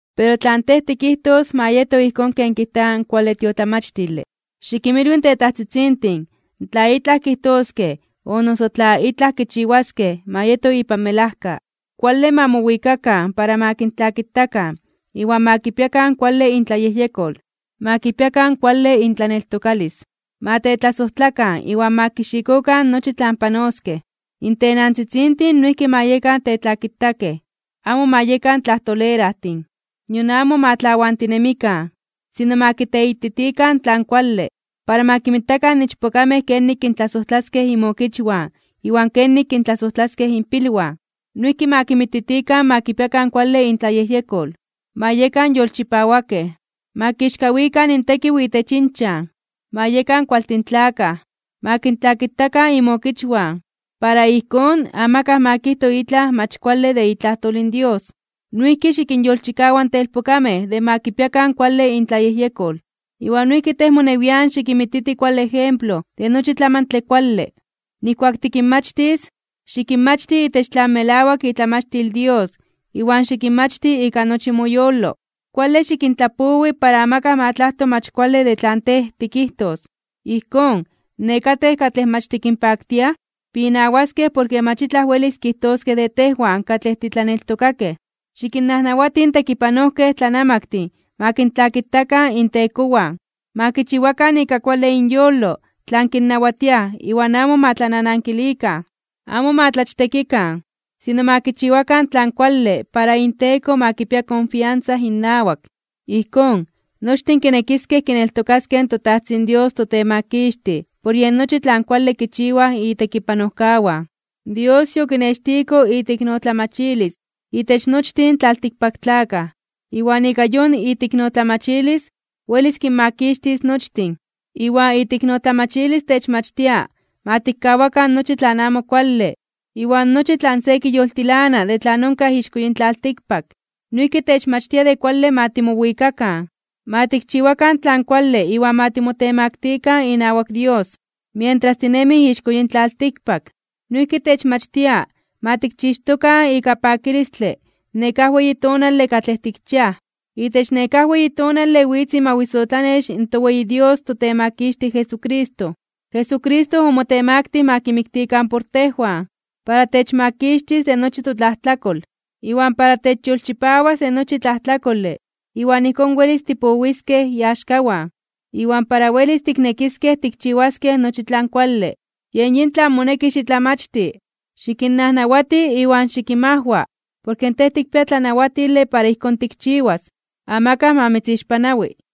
Pero tlan tej tikijtos ma yeto ijkón ken kijta in kuale tiotlamachtile. Xikinmilwi in tetajtzitzintin tla itlaj kijtoskej o noso tla itlaj kichiwaskej ma yeto ipan melajka, kuale ma mowikakan para ma kintlakitakan iwan ma kipiakan kuale intlayejyekol. Ma kipiakan kuale intlaneltokalis, ma tetlasojtlakan iwan ma kixikokan nochi tlan panoskej. In tenantzitzintin noijki ma yekan tetlakitakej, amo ma yekan tlajtolerajtin, nion amo ma tlawantinemikan. Sino ma kiteititikan tlan kuale, para ma kinmititikan ichpokamej kenik kintlasojtlaskej inmokichwan iwan kenik kintlasojtlaskej inpilwan. Noijki ma kinmititikan ma kipiakan kuale intlayejyekol, ma yekan yolchipawakej, ma kixkawikan (ma kinmomeli) intekiw itech inchan, ma yekan kualtin tlakaj, ma kintlakitakan inmokichwan, para ijkón amakaj ma kijto itlaj mach kuale de itlajtol in Dios. Noijki xikinyolchikawa in telpokamej de ma kipiakan kuale intlayejyekol, iwan noijki tej monewian xikinmititi kuale ejemplo de nochi tlamantle kuale. Nijkuak tikinmachtis, xikinmachti itech tlan melawak itlamachtil in Dios iwan xikinmachti ika nochi moyolo. Kuale xikintlapowi para amakaj ma tlajto mach kuale de tlan tej tikijtos. Ijkón, nekatej katlej mach tikinpaktiaj pinawaskej porke mach itlaj welis kijtoskej de tejwan katlej titlaneltokakej. Xikinnajnawati in tekipanojkej tlanamaktin ma kintlakitakan intekowan. Ma kichiwakan ika kuale inyolo tlan kinnawatiaj iwan amo ma tlananankilikan. Amo ma tlachtekikan, sino ma kichiwakan tlan kuale para inteko ma kipia konfiansa innawak. Ijkón, nochtin kinekiskej kineltokaskej in toTajtzin Dios toTemakixtij por yen nochi tlan kuale kichiwaj itekipanojkawan. Dios yokinextiko iteiknotlamachilis itech nochtin in tlaltikpaktlakaj, iwan ika yon iteiknotlamachilis welis kinmakixtis nochtin. Iwan iteiknotlamachilis techmachtia ma tikkawakan nochi tlan amo kuale iwan nochi tlan se kiyoltilana de tlan onkaj ixko yin tlaltikpak. Noijki techmachtia de kuale ma timowikakan, ma tikchiwakan tlan kuale iwan ma timotemaktikan inawak Dios, mientras tinemij ixko yin tlaltikpak. Noijki techmachtia ma tikchixtokan ika pakilistle nekáj weyi tonale katlej tikchiaj. Itech nekáj weyi tonale witz imawisotlanex in toweyi Dios toTemakixtij Jesucristo. Jesucristo omotemaktij (omotemaktilij) ma kimiktikan por tejwan, para techmakixtis de nochi totlajtlakol, iwan para techyolchipawas de nochi tlajtlajkole iwan ijkón welis tipowiskej iaxkawan, iwan para welis tiknekiskej tikchiwaskej nochi tlan kuale. Yen yin tlan moneki xitlamachti, xikinnajnawati iwan xikinmajwa porke tej tikpia tlanawatile para ijkón tikchiwas. Amakaj ma mitzixpanawi.